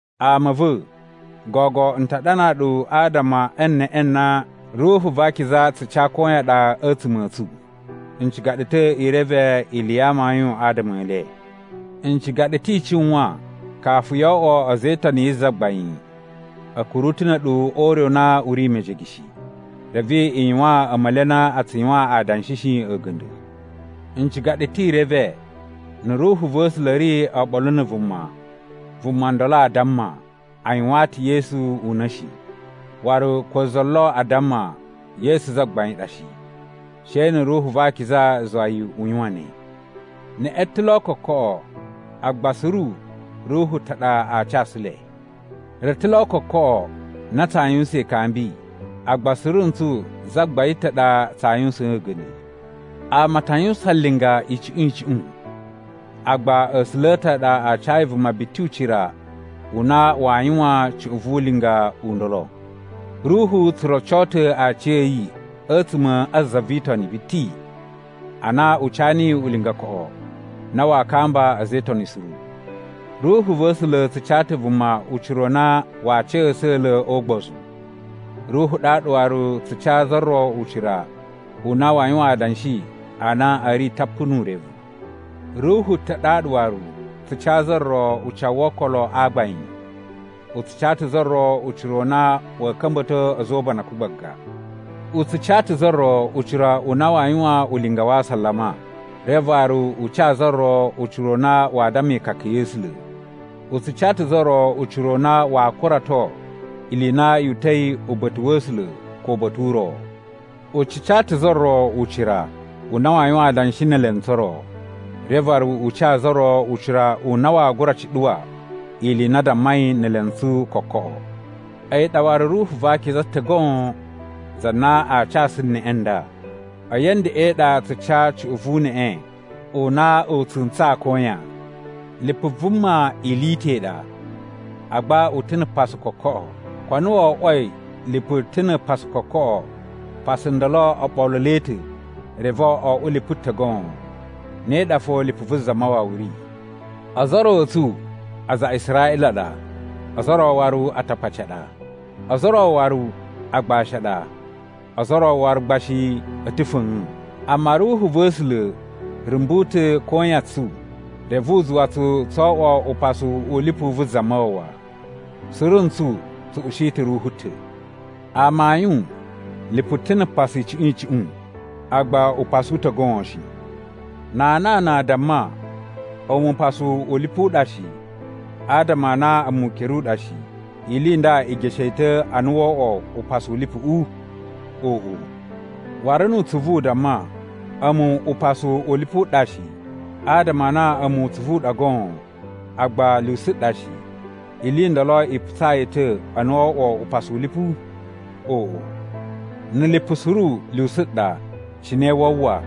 Ama a̱ va̱, gogo n ta ɗanaa ɗu adama e neꞌe na Ruhu va Akiza tsu ca koyan ɗa a̱tsuma̱ a̱ tsu. N ciga ɗu ta̱ i reve ili ya amayun adama e le. N ciga ɗu ta̱ i cuwan kafu yo oꞌwo a̱za̱ e Itoni yi Zagbain, a̱ kuru ta̱ na̱ a̱ɗu o ure u na u ri mejege shi, reve i yuwaan a̱ma̱li a na a tsu yuwan adanshi shi a̱ga̱nda̱. N ciga ɗu ta̱ i reve na̱ Ruhu va̱ A̱sula̱ ri oɓolo na̱ vuma, vuma ndolo a damma, “A yuwaan ta̱ Yesu una̱!” shi. Waru ko za lo aa damma, “Yesu Zagbain ɗa” shi, she na̱ Ruhu va Akiza zuwa yi u yuwan ne. Neꞌe ta̱ lo kokoꞌo, agba suru Ruhu ta̱ ɗa aa casu le. Re ta̱ lo kokoꞌo na tsaa yuwusan ikambi, agba suru ntsu Zagbain ta̱ ɗa tsaa yuwusaan a̱ga̱nda̱. Ama a ta yuwusan linga icuꞌun icuꞌun, agba A̱sula̱ a̱ ta̱ a ɗa a cayi vuma biti ucira u na waa yuwan cuꞌun vu ulinga u ndolo. Ruhu tsu roco ta̱ aciya̱yi a̱tsuma̱ a za vi Itoni biti ana u ca niyi ulinga koꞌo na waa kamba a̱za̱ e Itoni suru. Ruhu va̱ A̱sula̱ tsu ca ta̱ vuma ucira u na waa ca a̱sa̱la̱ o ugbozu. Ruhu ɗaɗa waru tsu ca za ro ucira u na waa yuwan adanshi a na a̱ ri tapu nu urevu. Ruhu ta̱ ɗaɗa waru tsu ca za ro ucawu wo okolo a gbain. U tsu ca ta̱ za ro ucira u na wa̱a̱ ka̱mba̱to a̱za̱ o ubanakun gbaga. U tsu ca ta̱ za ro ucira u na waa yuwan ulinga wa asalama, reve waru u ca za ro ucira u na waa damma ikaka ya̱ A̱sula̱. U tsu ca ta̱ za ro ucira u na waa kurato ili i na yu uta̱i uba̱ta̱ wa̱ A̱sula̱ ko uba̱ta̱ u ro. U tsu ca ta̱ za ro ucira u na waa yuwan adanshi ne elentsu o ro. Reve waru u ca za ro ucira u na waa gura cuɗuwa ili i na a dammai ne elentsu kokoꞌo. A̱yi ɗa waru Ruhu va Akiza ta̱ goon za na aa casu neꞌe nda. A̱yi a̱ ndeꞌen ɗa tsu ca cuꞌun vu uneꞌe u na u tsu ntsaa koyan. Lipu vuma ili i ta̱ i ɗa, agba u ta̱ na̱ pasu kokoꞌo. Ko a na wo oꞌwoi lipu ta̱ na̱ pasu kokoꞌo, pasu ndolo o ɓoluloi ta̱ reve o oꞌwo lipu ta̱ goon. Ne ɗa fo lipu vu Zamawawa ri. Ozo o ro a̱ tsu aza a Israꞌila a ɗa, ozo o ro waru Atakpaci a ɗa. Ozo o ro waru agbashi a ɗa ozo o ro waru gba shi a̱ ta̱ fa̱a̱n. Amma Ruhu va̱ A̱sula̱ rumbu ta̱ koyan tsu reve u zuwa tsu tso oꞌwo upasu u lipu vu Zamawawa. Suru ntsu tsu ushi ta̱ Ruhu ta̱. Amayun, lipu ta̱ na̱ pasu icuꞌun icuꞌun, agba upasu u ta̱ goon shi. Na anana a damma, “A̱mu upasu u lipu u ɗa shi, adama a na a̱mu ukere u ɗa shi,” ili i nda i geshe yi ta̱ a na woo oꞌwo upasu u lipuꞌu? Oꞌo! Waru nu utsuvu u damma, “A̱mu upasu u lipu u ɗa shi, adama a na a̱mu utsuvu u ɗa goon agba lyusu ɗa shi,” ili i ndolo i putsaa yi ta̱ a na wo oꞌwo upasu u lipu? Oꞌo! Na̱ lipu suru lyusu ɗa, cine waa uwwa?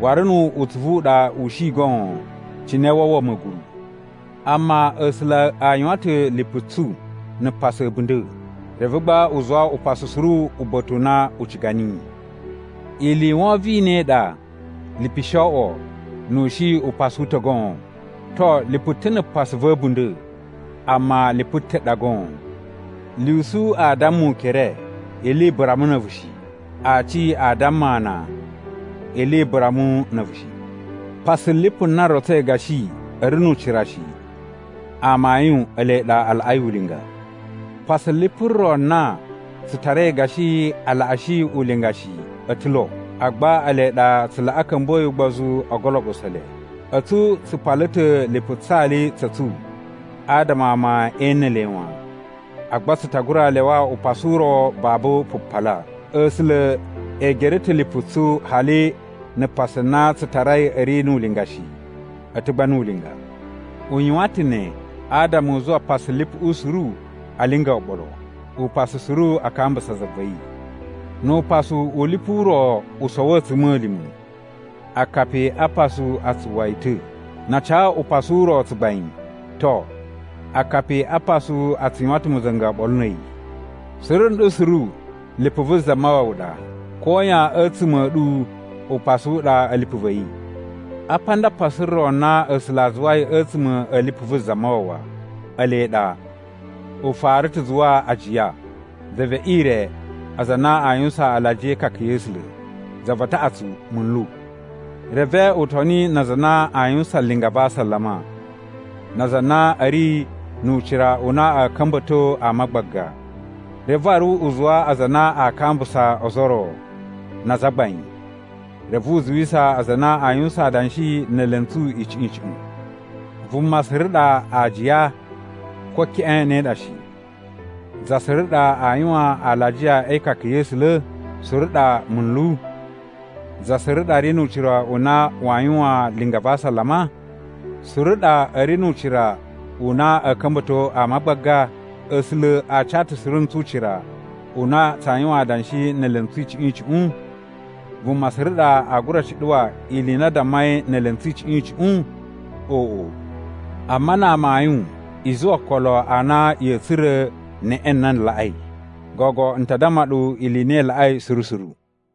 Waru nu utsuvu u ɗa u shi goon, cine wa uwwa ma̱guru? Amma A̱sula̱ a yuwan ta̱ lipu tsu na̱ pasu a̱bunda̱, reve gba u zuwa upasu suru uba̱ta̱ u na u ciga niyi. Ili i wovon i ne i ɗa lipu shi oꞌwo nu u shi upasu u ta̱ goon! To, lipu ta̱ na̱ pasu va̱ a̱bunda̱, amma lipu ta̱ ɗa goon. Lyusu aa damma ukere, “Ili i bura mu na̱ a̱vu” shi. Aaci aa damma ana, “Ili i bura mu na̱ a̱vu” shi. Pasu lipu na rotsoi gashi a̱ ri nu ucira shi, amayun ele ɗa a laꞌai ulinga. Pasu lipu ro na tsu tarai gashi a laꞌashi ulinga shi o ta̱ lo, agba ele ɗa tsu laꞌa ka̱mbuwa̱yi ugbozu o ugoloɓuso u le. A̱tsu tsu pala ta̱ lipu tsali tsa̱ tsu adama ama e ene le wan, agba tsu ta gura lyawa upasu u ro babu pupala. A̱sula̱ e gere ta̱ lipu tsu hali na̱ pasu na tsu tarai a̱ ri nu ulinga shi, a̱ ta̱ gba nu ulinga. U yuwan ta̱ ne adama u zuwa pasu lipuꞌu suru a linga oɓolo, upasu suru a kambusa za va̱ yi. Nu upasu u lipu u ro u sowo a̱tsuma̱lima̱, akapi a pasu a tsu uwwa yi ta̱. Na a ca upasu u ro tsugbain, to, akapi a pasu a tsu yuwan ta̱ ma̱za̱nga̱ oɓolo na̱ a̱yi. Suru nɗu suru lipu vu Zamawawa ɗa. Koyan a̱tsuma̱ a̱ ɗu upasu u ɗa a̱ lipu va̱ yi. Apa nda pasu ro na A̱sula̱ a zuwai a̱tsuma̱ a̱ lipu vu Zamawawa. Ele ɗa: U fara ta̱ zuwa ajiya, za ve ire, aza a na a yuwusan alajiya e ikaka ya̱ A̱sula̱, za va taꞌatsu munlu. Reve u toni na aza a na a yuwusan linga va asalama, na aza a na a̱ ri nu ucira u na a̱ ka̱mba̱to ama gbaga. Reve waru u zuwa aza a na aa kambusa ozo o ro, na azagbain. Reve u zuwisa aza a na aa yuwusan adanshi ne elentsu icuꞌun icuꞌun. Vuma suru ɗa aajiya? Ko keꞌen ne ɗa shi. Za suru ɗa a yuwan alajiya e ikaka ya̱ A̱sula̱? Suru ɗa munlu? Za suru ɗa ri nu ucira u na waa yuwan linga va asalama? Suru ɗa a̱ ri nu ucira u na a̱a̱ ka̱mba̱to ama gbaga? A̱sula̱ a ca ta̱ suru ntsu ucira u na tsaa yuwan adanshi ne elentsu icuꞌun icuꞌun? Vuma suru ɗa aa gura cuɗuwa ili i na a dammai ne elentsu icuꞌun icuꞌun? Oꞌo! Amma na amayun i zuwa okolo a na ya̱a̱ tsura̱ neꞌe na laꞌai. Gogo n ta damma ɗu ili i na i laꞌai suru suru.